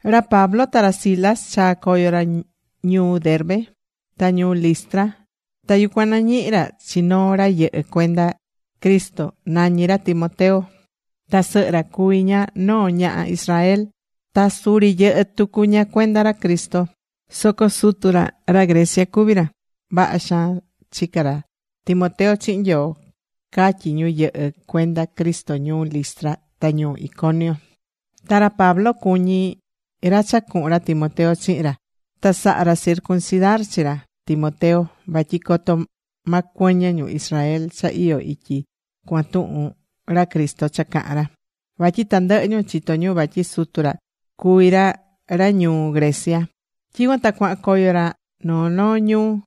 Ra Pablo ta ra Silas chaa̱ coyo ra ñuu Derbe, ta ñuu Listra. Ta yucuan nañihi̱ ra chi noo ra yɨhɨ cuenda Cristo. Nañí ra Timoteo. Ta sɨhɨ ra cuví ña noo ñaha Israel. Ta suri yɨhɨ́ tucu ña cuenda ra Cristo. Soco sutu ra ra Grecia cuvi ra. Vaha xaan chicá ra Timoteo chihin Nyoo catyí ñu yɨhɨ cuenda Cristo ñuu Listra ta ñuu Iconio. Ta ra Pablo cuñí ra cha cuhun ra Timoteo chihin ra. Ta saha̱ ra circuncidar chi ra Timoteo. Vatyi coto ma cuɨñɨ ñu Israel cha iyó ityi cuan tuhun ra Cristo cha cahán ra. Vatyi tandɨhɨ ñu chitó ñu vatyi sutu ra cuví ra ra ñuu Grecia. Tyicuan ta cuahan coyo ra noo noo ñuu.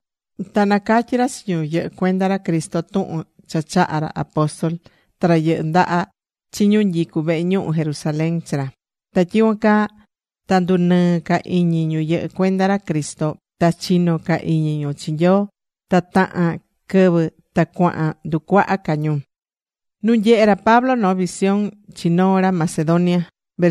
Ta nacatyi̱ ra chi ñu yɨhɨ cuenda ra Cristo tuhun cha chaha̱ ra apóstol ta ra yɨhɨ ndaha chi ñu nyicu vehe ñuhu Jerusalén chi ra. Ta tyicuan caa ta ndunɨɨ̱ ca iñi ñu yɨhɨ́ cuenda ra Cristo ta chino ca iñi ñu chi Nyoo. Ta tahan quɨvɨ ta cuahan nducuaha ca ñu.Nu nyehé ra Pablo noo visión chi noo ra Macedonia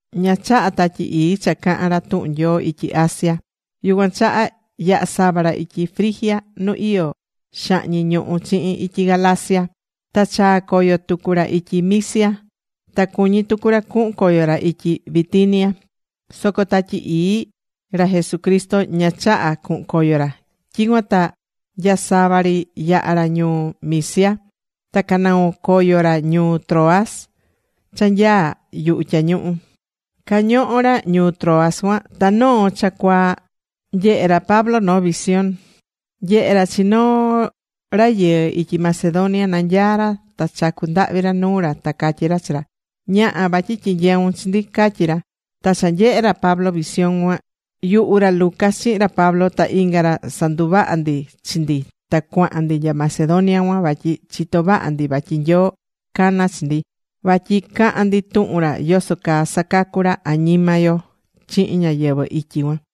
Ña chaha̱ Tatyi Ii cha cahan ra tuhun Nyoo ityi Asia. Yucuan chaha yaha̱ sava ra ityi Frigia nu iyó xahñi ñuhu chihin ityi Galacia. Ta chaa̱ coyo tucu ra ityi Misia. Ta cuñí tucu ra cuhun coyo ra ityi Bitinia, soco Tatyi Ii ra Jesucristo ña chaha̱ cuhun coyo ra. Tyicuan ta nya sava ri yaha̱ ra ñuu Misia ta canoo̱ coyo ra ñuu Troas cha nyaá yuhu tyañuhu. Cañohó ra ñuu Troas cuan, ta noo cha cuaa nyehe̱ ra Pablo noo visión. Nyehe̱ ra chi noo rayɨɨ ityi Macedonia. Nanyaá ra ta chacú ndahvi ra nuu ra, ta catyí ra chi ra: “Ña̱ha, vatyi tyinyeun chi ndi”, catyi ra. Ta cha nyehe̱ ra Pablo visión cuan, yuhu ra Lucas chihin ra Pablo ta inga ra sanduvaha̱ ndi chi ndi ta cuahan ndi nya Macedonia cuan. Vatyi chitó vaha ndi vatyi Nyoo cana̱ chi ndi, vatyi cahan ndi tuhun ra yoso caa sacacú ra añima yo chihin ñáyɨvɨ ityi cuan.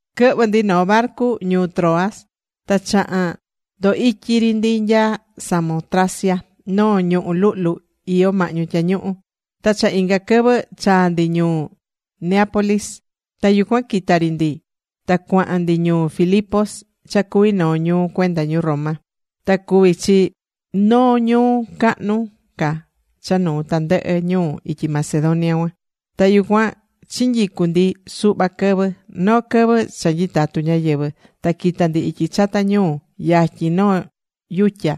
Quɨhvɨ̱ ndi noo barcu ñuu Troas. Ta chaha̱n ndoo ityi ri ndi nya Samotracia noo ñuhú luhlu iyó mahñu tyañuhu. Ta cha inga quɨvɨ chaa̱ ndi ñuu Neápolis. Ta yucuan quita̱ ri ndi ta cuahan ndi ñuu Filipos cha cuví noo ñuu cuenda ñu Roma. Ta cuví chi noo ñuu cahnu ca cha nuu tandɨhɨ ñuu ityi Macedonia cuan. Ta yucuan chinyicu̱ ndi suhva quɨvɨ. Noo quɨvɨ cha nyitatu ñáyɨvɨ ta quita̱ ndi ityi chata ñuu, yatyin noo yutya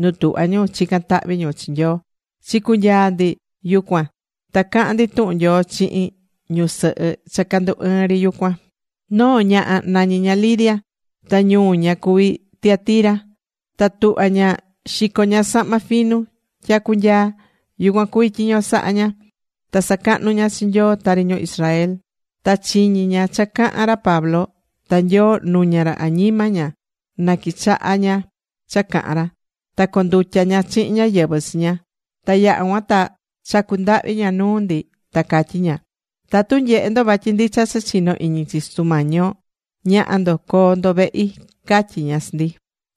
nu tuhvá ñu chican tahvi ñu chi Nyoo. Chicunyaa̱ ndi yucuan ta caha̱n ndi tuhun Nyoo chihin ñusɨhɨ cha candu ɨɨn ri yucuan. Noo ñaha nañí ña Lidia. Ta ñuu ña cuví Tiatira. Ta tuhvá ña xico ña sahma finu, tyacu nyaa. Yucuan cuví tyiño sahá ña. Ta sacahnú ña chi Nyoo tari ñu Israel. Ta chiñí ña cha cahán ra Pablo. Ta Nyoo nuña ra añima ña na quichaha ña cha cahan ra. Ta condutya̱ ña chihin ñáyɨvɨ chi ña. Ta yaha̱ cuan ta chacu̱ ndahvi ña nuu ndi, ta catyí ña: ―Tatu nyehé ndo vatyi ndicha cha chinó iñi chi Sutu Mañi yo, ña̱ha ndo, co̱o ndo vehi ―catyí ña chi ndi.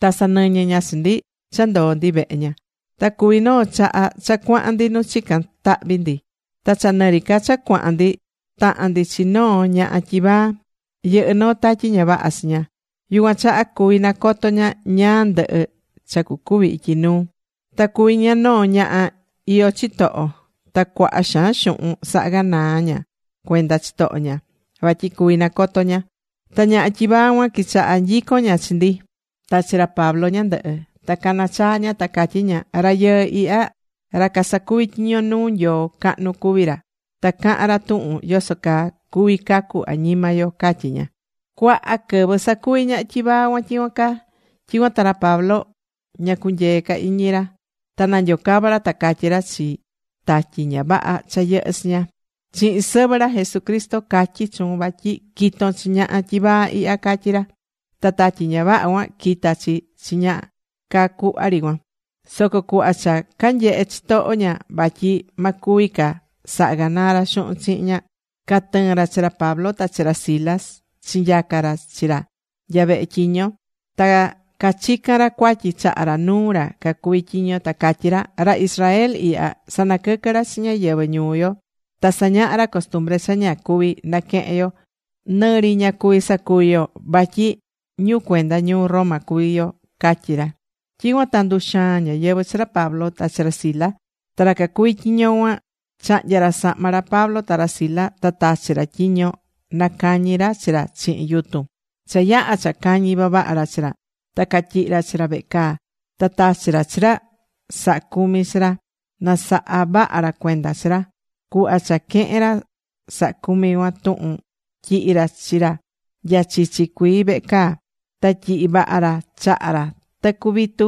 Ta sanɨñɨ̱ ña chi ndi cha ndoo ndi vehe ña. Ta cuvi̱ noo chaha cha cuahan ndi nu chicán tahvi ndi. Ta cha nɨri ca cha cuahan ndi, tahan ndi chi noo ñaha tyivaa. Yɨhɨ́ noo tatyi ña vaha chi ña. Yucuan chaha cuví nacoto ña ñáá ndɨhɨ cha cucuvi ityi nuu. Ta cuví ña noo ñaha iyó chitoho. Ta cuaha xaan xuhun sahá ganaa ña cuenda chitoho ña, vatyi cuví nacotó ña. Ta ñaha tyivaa cuan quichaha̱ nyicon ña chi ndi, ta chi ra Pablo ñandɨhɨ. Ta cana̱ chaa ña ta catyí ña: ―Rayɨɨ ihya ra casacuví tyiño nuu Nyoo cahnu cuví ra. Ta cahán ra tuhun yoso caa cuví cacu añima yo ―catyí ña. Cuaha quɨvɨ sacuvi̱ ñaha tyivaa cuan tyicuan caa. Tyicuan ta ra Pablo ña cunyee̱ ca iñi ra, ta nanyocava̱ ra ta catyí ra chi tatyi ña vaha cha yɨhɨ́ chi ña: ―Chihin sɨvɨ ra Jesucristo catyi chuun vatyi qui̱ton chi ñaha tyivaa ihya ―catyí ra. Ta tatyi ña vaha cuan quita̱ chi chi ña caa cuhva ri cuan. Soco cuhva cha canyehe̱ chitoho ña vatyi ma cuvi ca saha ganaa ra xuhun chihin ña, catɨɨ̱n ra chi ra Pablo ta ra Silas chinyaca̱ ra chi ra nya vehe tyiño. Ta cachica̱n ra cuatyi chaha ra nuu ra cacuví tyiño. Ta catyí ra: ―Ra Israel ihya sanaquɨquɨ́ ra chi ñáyɨvɨ ñuu yo. Ta sañahá ra costumbre cha ña cuví naquehen yo, nɨri ña cuví sacuvi yo vatyi ñu cuenda ñuu Roma cuví yo ―catyí ra. Tyicuan ta nduxaa̱n ñáyɨvɨ chi ra Pablo ta ra Silas. Ta ra cacuví tyiño cuan chahnya̱ ra sahma ra Pablo ta ra Silas ta tachi̱ ra tyiño nacañi ra chi ra chihin yutun. Cha yaha̱ cha cañi̱ vavaha ra chi ra, ta catyihi̱ ra chi ra vehe caa. Ta tachi̱ ra chi ra sahá cumi chi ra na saha vaha ra cuenda chi ra. Cuhva cha quehe̱n ra sahá cumi cuan tuhun, tyihi̱ ra chi ra nya chichi cuii vehe caa. Ta tyihi̱ vaha ra chaha ra tɨcu vitu.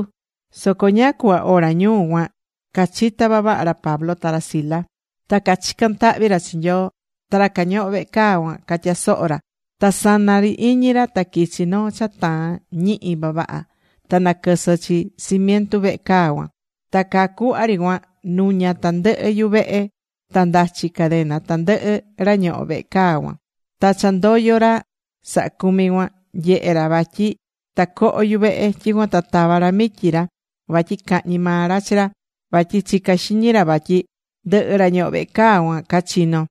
Soco ñáá cuhva hora ñuu cuan cachitá vavaha ra Pablo ta ra Silas. Ta cachicán tahvi ra chi Nyoo. Ta ra cañohó vehe caa cuan catyasohó ra. Ta saná iñi ra ta quichi̱ noo cha taan ñihi vavaha. Ta naquɨsɨ chi cimientu vehe caa cuan, ta caa cuhva ri cuan nuña̱ tandɨhɨ yuvehe, ta ndachi cadena tandɨhɨ ra ñohó vehe caa cuan. Ta cha ndoyo̱ ra sahá cumi cuan, nyehe̱ ra vatyi tacoho yuvehe. Tyicuan ta tava̱ ra mityi ra vatyi cahñi maa ra chi ra. Vatyi chicá xiñi ra vatyi ndɨhɨ ra ñohó vehe caa cuan cachino̱.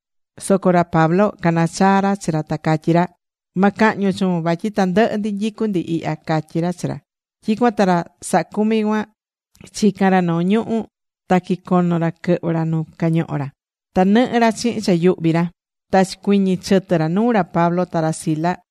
Soco ra Pablo cana̱ chaa ra chi ra, ta catyí ra: ―Ma cahñun chuun, vatyi tandɨhɨ ndi nyicú ndi ihya ―catyí ra chi ra. Tyicuan ta ra sahá cumi cuan chica̱n ra noo ñuhu̱. Ta quicono̱ ra quɨhvɨ̱ ra nu cañohó ra. Ta nɨhɨ́ ra chihin cha yuhví ra. Ta chicuiñi̱ chɨtɨ ra nuu ra Pablo ta ra Silas.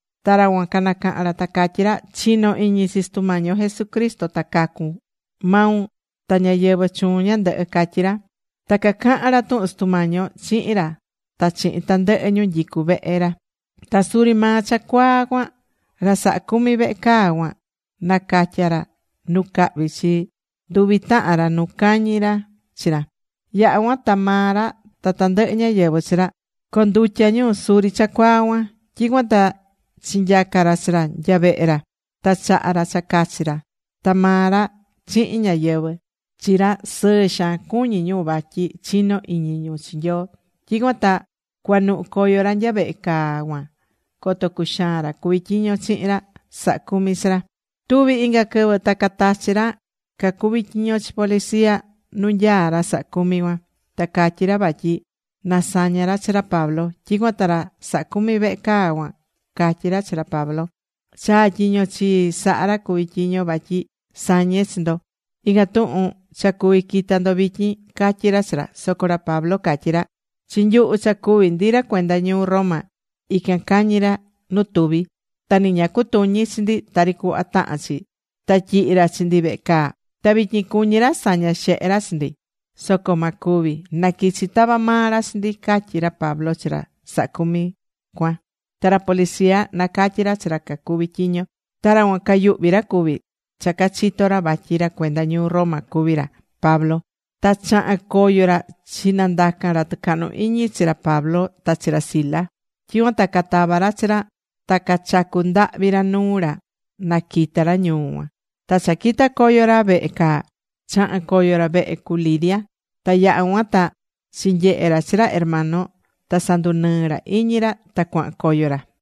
Ta ra cuan canacaha̱n ra ta cacatyí ra: ―Chi̱no iñi chi Sutu Mañi yo Jesucristo ta cacun, maun ta ñáyɨvɨ chuun ñandɨhɨ ―catyí ra. Ta cacaha̱n ra tuhun Sutu Mañi yo chihin ra ta chihin tandɨhɨ ñu nyicu vehe ra. Ta suri maa cha cuaa cuan ra sahá cumi vehe caa cuan nacatya̱ ra nu cahvi chi nduvi tahan ra nu cañi̱ ra chi ra. Yaha̱ cuan ta maa ra ta tandɨhɨ ñáyɨvɨ chi ra condutya̱ ñu suri cha cuaa cuan. Tyicuan ta chinyaca̱ ra chi ra nya vehe ra. Ta chaha̱ ra cha cachi ra. Ta maa ra chihin ñáyɨvɨ chi ra sɨɨ xaan cuñí ñu vatyi chinó iñi ñu chi Nyoo. [Tyicuan ta cuanuhu coyo ra nya vehe caa cuan coto cuxaan ra cuví tyiño chihin ra saha cumi chi ra.] Tuvi̱ inga quɨvɨ ta catachi̱ ra cacuví tyiño chi policia nu nyaá ra sahá cumi cuan, ta catyí ra vatyi na saña ra chi ra Pablo. Tyicuan ta ra sahá cumi vehe caa cuan catyí ra chi ra Pablo: ―Chaa̱ tyiño chii saha̱ ra cuví tyiño, vatyi sañe chi ndo. Ican tuhun cha cuví quita ndo vityin ―catyí ra chi ra. Soco ra Pablo catyí ra: ―Chi nyuhu cha cuví ndi ra cuenda ñuu Roma ican cañi̱ ra nu tuvi. Ta ni ña cutuñi̱ chi ndi tari cuhva tahán chi. Ta tyihi̱ ra chi ndi vehe caa. Ta vityin cuñí ra saña xehe ra chi ndi. Soco ma cuvi̱. Na̱quichi ta̱va maa ra chi ndi ―catyí ra Pablo chi ra sahá cumi cuan. Ta ra policia nacatyi̱ ra chi ra cacuví tyiño. Ta ra cuan cayuhvi ra cuvi̱ cha cachitó ra vatyi ra cuenda ñuu Roma cuví ra Pablo. Ta chaha̱n coyo ra chinandaca̱n ra tɨcahnu iñi chi ra Pablo ta chi ra Silas. Tyicuan ta catava̱ ra chi ra ta cachacu̱ ndahvi ra nuu ra na quita ra ñuu cuan. Ta cha quita̱ coyo ra vehe caa, chaha̱n coyo ra vehe cu Lidia. Ta yaha̱ cuan ta chinyehe̱ ra chi ra hermano ta sandunɨɨ̱ ra iñi ra ta cuahan coyo ra.